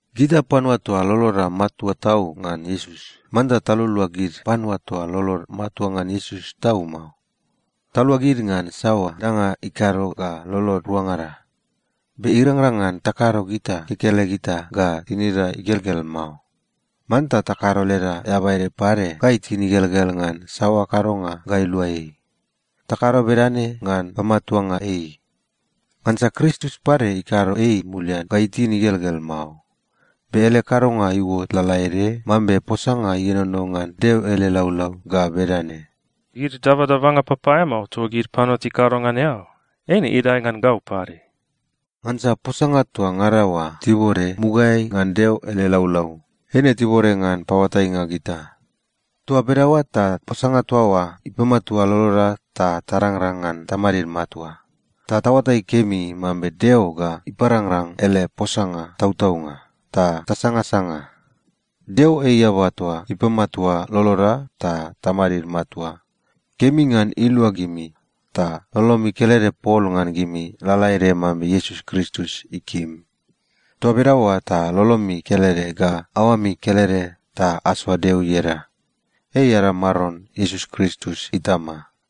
Gita panua toa loloda matua tau ngan Iesus, manta talualua gid panua toa lolod matua ngan Iesus tau mao. Talua gid ngan saoa danga ikado ga lolod ruangada. Be irangrang ngan takado gita kekelegita ga tinida igelgel mao. Manta takado leda eaba ede pade ga itin igelgel ngan saoa kadonga ga ilua ei. Takado bedane ngan pamatuanga ei. Ngansa Kristus pade ikado ei mulian ga itin igelgel mao, be ele kadonga iuot lalaede mambe posanga ienono ngan Deo ele laulau ga bedane, “Gid dabadabanga papaeamao toa gid panua tikado ngan eao, eine idae ngan gau pade.” Ngansa posanga toa ngada oa tibode mugaeai ngan Deo ele laulau, eine tibode ngan paoatainga gita. Toa bedaoa ta posanga toa oa ipamatua loloda ta tarangrang ngan tamadid matua, ta taoatai kemi mambe Deo ga iparangrang ele posanga tautaunga, ta tasangasanga. Deo ei eaba toa ipamatua loloda ta tamadid matua. Kemi ngan ilua gimi ta lolomi kelede pol ngan gimi, lalaede mambe Iesus Kristus ikim. Toa bedaoa ta lolomi kelede ga aoami kelede ta asoa Deo ieda. Ei ada Maron Iesus Kristus Itama.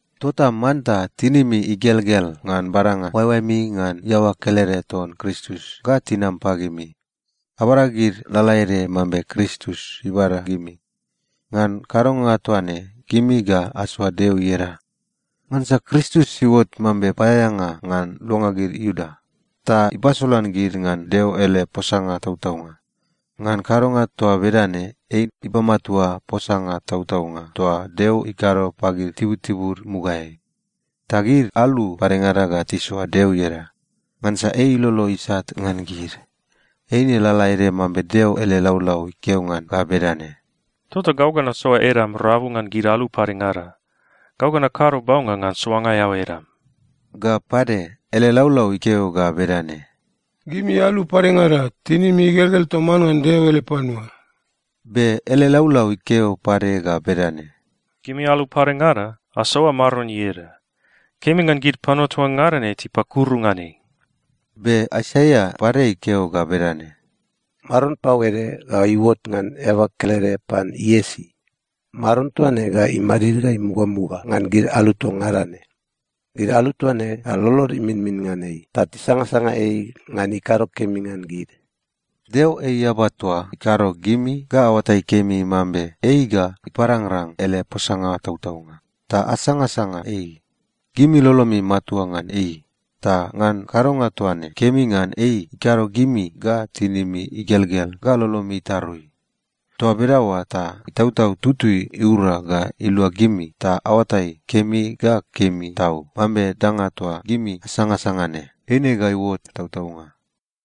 Tota manta tinimi igelgel ngan badanga oaeoaemi ngan iaoa kelede ton Kristus ga tinam pagimi. Abada gid lalaede mambe Kristus ibada gimi. Ngan kadonga toa ne, gimi ga asoa Deo ieda. Ngansa Kristus iuot mambe paeaeanga ngan luanga gid Iuda, ta ipasolan gid ngan Deo ele posanga tautaunga. Ngan kadonga toa bedane, ei ipamatua posanga tautaunga toa Deo ikado pagid tibutibud mugaeai. Ta gid alu padengada ga tisoa Deo ieda, ngansa ei ilolo isat ngan gid. Eine lalaede mambe Deo ele laulau ikeo ngan ga bedane, “Tota gau ga nasoa edam rabu ngan gid alu padengada. Gau ga nakado baunga ngan soanga eao edam.” Ga pade, ele laulau ikeo ga bedane, “Gimi alu padengada, tinimi igelgel toman ngan Deo ele panua.” Be ele laulau ikeo pade ga bedane, “Gimi alu padengada, asoa Maron ieda. Kemi ngan gid panua toa ngada ne tipakuru ngan ei.” Be Aisaia pade ikeo ga bedane, “Maron pau ede ga iuot ngan iaoa kelede pan Iesi. Maron toa ne ga imadid ga imugamuga ngan gid alu toa ngada ne. Gid alu toa ne ga lolod iminmin ngan ei ta tisangasanga ei ngan ikado kemi ngan gid.” Deo ei eaba toa ikado gimi ga aoatai kemi mambe ei ga iparangrang ele posanga tautaunga, ta asangasanga ei. Gimi lolomi matua ngan ei, ta ngan kadonga toa ne, kemi ngan ei ikado gimi ga tinimi igelgel ga lolomi itarui. Toa bedaoa ta Itautau Tutui iura ga ilua gimi ta aoatai kemi ga kemi tau mambe danga toa gimi asangasanga ne, eine ga iuot tautaunga.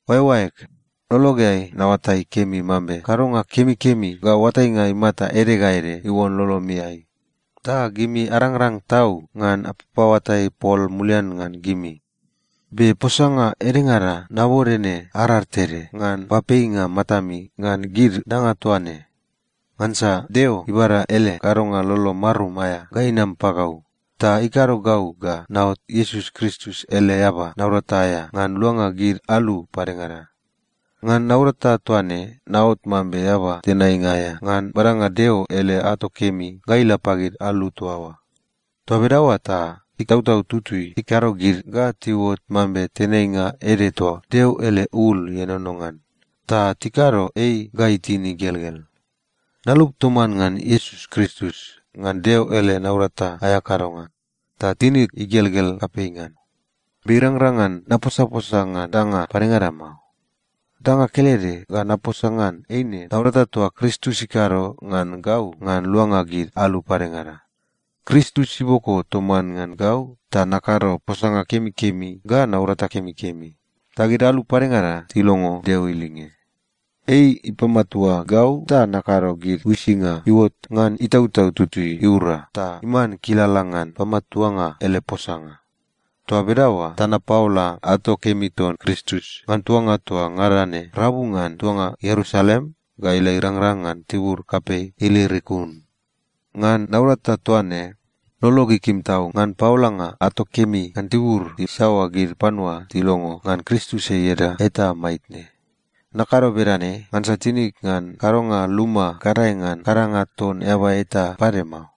Oaeoaeg, lologeai naoatai kemi mambe kadonga kemikemi ga oatainga imata ede ga ede iuon lolomiai. Ta gimi arangrang tau ngan apapaoatai pol mulian ngan gimi. Be posanga edengada nabode ne arar tede ngan papeinga matami ngan gid danga toa ne. Ngansa Deo ibada ele kadonga lolo marum aea ga inam pagau ta ikado gau ga naot Iesus Kristus ele eaba naurata aea ngan luanga gid alu padengada. Ngan naurata toa ne, naot mambe eaba tenainga aea ngan badanga Deo ele ato kemi ga ila pagid alu toa oa. Toa bedaoa ta Itautau Tutui ikado gid ga tiuot mambe tenainga ede toa Deo ele ul ienono ngan, ta tikado ei ga itin igelgel. Nalup toman ngan Iesus Kristus ngan Deo ele naurata aea kadonga, ta tinig igelgel kapei ngan. Be irangrang ngan naposaposa ngan danga padengada mao. Danga kelede ga naposa ngan eine naurata toa Kristus ikado ngan gau ngan luanga gid alu padengada. Kristus iboko toman ngan gau ta nakado posanga kemikemi ga naurata kemikemi, ta gid alu padengada tilongo Deo ilinge. Ei ipamatua gau ta nakado gid uisinga iuot ngan Itautau Tutui iura ta iman kilala ngan pamatuanga ele posanga. Toa bedaoa ta napaola ato kemi ton Kristus ngan tuanga toa ngada ne rabu ngan tuanga Ierusalem ga ila irangrang ngan tibur kapei Ilirikum. Ngan naurata toa ne, lolog ikim tau ngan paolanga ato kemi ngan tibur isaoa gid panua tilongo ngan Kristus ieda eta maitne. Nakado bedane ngansa tinig ngan kadonga luma gadae ngan kadanga ton eaba eta pade mao.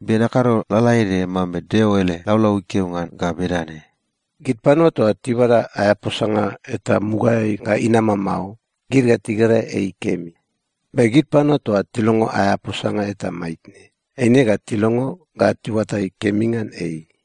Be nakado lalaede mambe Deo ele laulau ikeo ngan ga bedane, “Gid panua toa tibada aea posanga eta mugaeai ga inama mao, gid ga tigera ei kemi. Be gid panua toa tilongo aea posanga eta maitne, eine ga tilongo ga tiuatai kemi ngan ei.”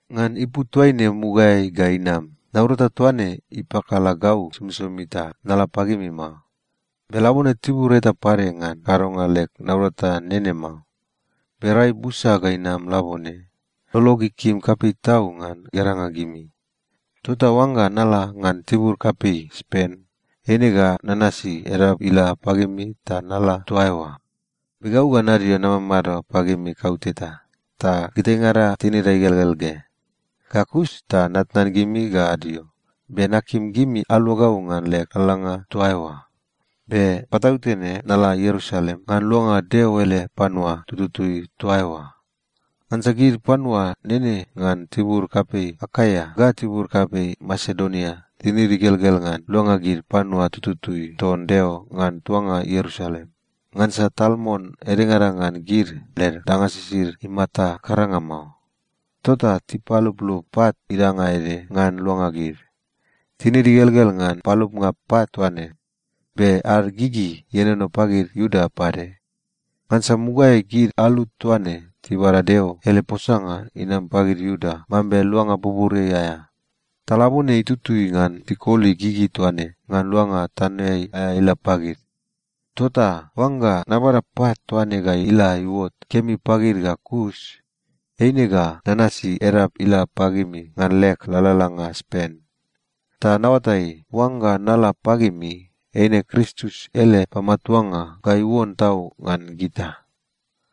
Ngan ipu toaine mugaeai ga inam, naurata toa ne ipakala gau somisomi ta nala pagimi mao. Be labone tibur eta pade ngan kadonga leg naurata nene mao. Be rai busa ga inam labone, lolog ikim kapei tau ngan geranga gimi. Tota oangga nala ngan tibur kapei Spen, eine ga nanasi edap ila pagimi ta nala toa eoa. Be gau ga nadio namamado pagimi kauteta, ta gitaingada tinida igelgel ge. Ga kus ta natnan gimi ga adio, be nakim gimi alua gau ngan leg lalalanga toa eoa. Be patautene nala Ierusalem ngan luanga Deo ele panua tututui toa eoa. Ngansa gid panua nene ngan tibur kapei Akaia ga tibur kapei Masedonia tinid igelgel ngan luanga gid panua tututui ton Deo ngan tuanga Ierusalem, ngansa tal mon edengada ngan gid, led danga sisid imata karanga mao. Tota tipaluplup pat idanga ede ngan luanga gid. Tinid igelgel ngan palupnga pat toa ne, be ad gigi ienono pagid Iuda pade. Ngansa mugaeai gid alu toa ne tibada Deo ele posanga inam pagid Iuda mambe luanga buburiai aea. Ta labone itutui ngan tikoli gigi toa ne ngan luanga tanoeai aea ila pagid. Tota oangga nabada pat toa ne ga ila iuot kemi pagid ga kus, eine ga nanasi edap ila pagimi ngan leg lalalanga Spen. Ta naoatai, oangga nala pagimi, eine Kristus ele pamatuanga ga iuon tau ngan gita.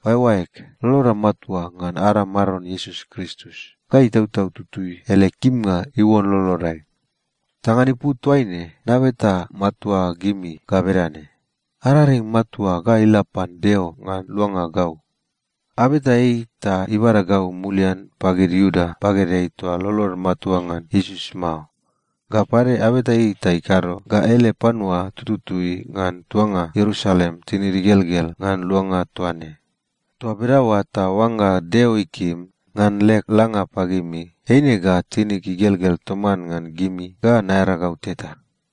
Oaeoaeg, loloda matua ngan ada Maron Iesus Kristus, ga Itautau Tutui ele kimnga iuon lolodai. Ta ngan ipu toaine nabeta matua gimi ga bedane: Araring matua ga ila pan Deo ngan luanga gau. Abeta ei ta ibada gau mulian pagid Iuda bagedeai toa lolod matua ngan Iesus mao. Ga pade, abeta ei ta ikado ga ele panua tututui ngan tuanga Ierusalem tinid igelgel ngan luanga toa ne. Toa bedaoa ta oangga Deo ikim, ngan leg langa pagimi, eine ga tinig igelgel toman ngan gimi ga naearagau teta.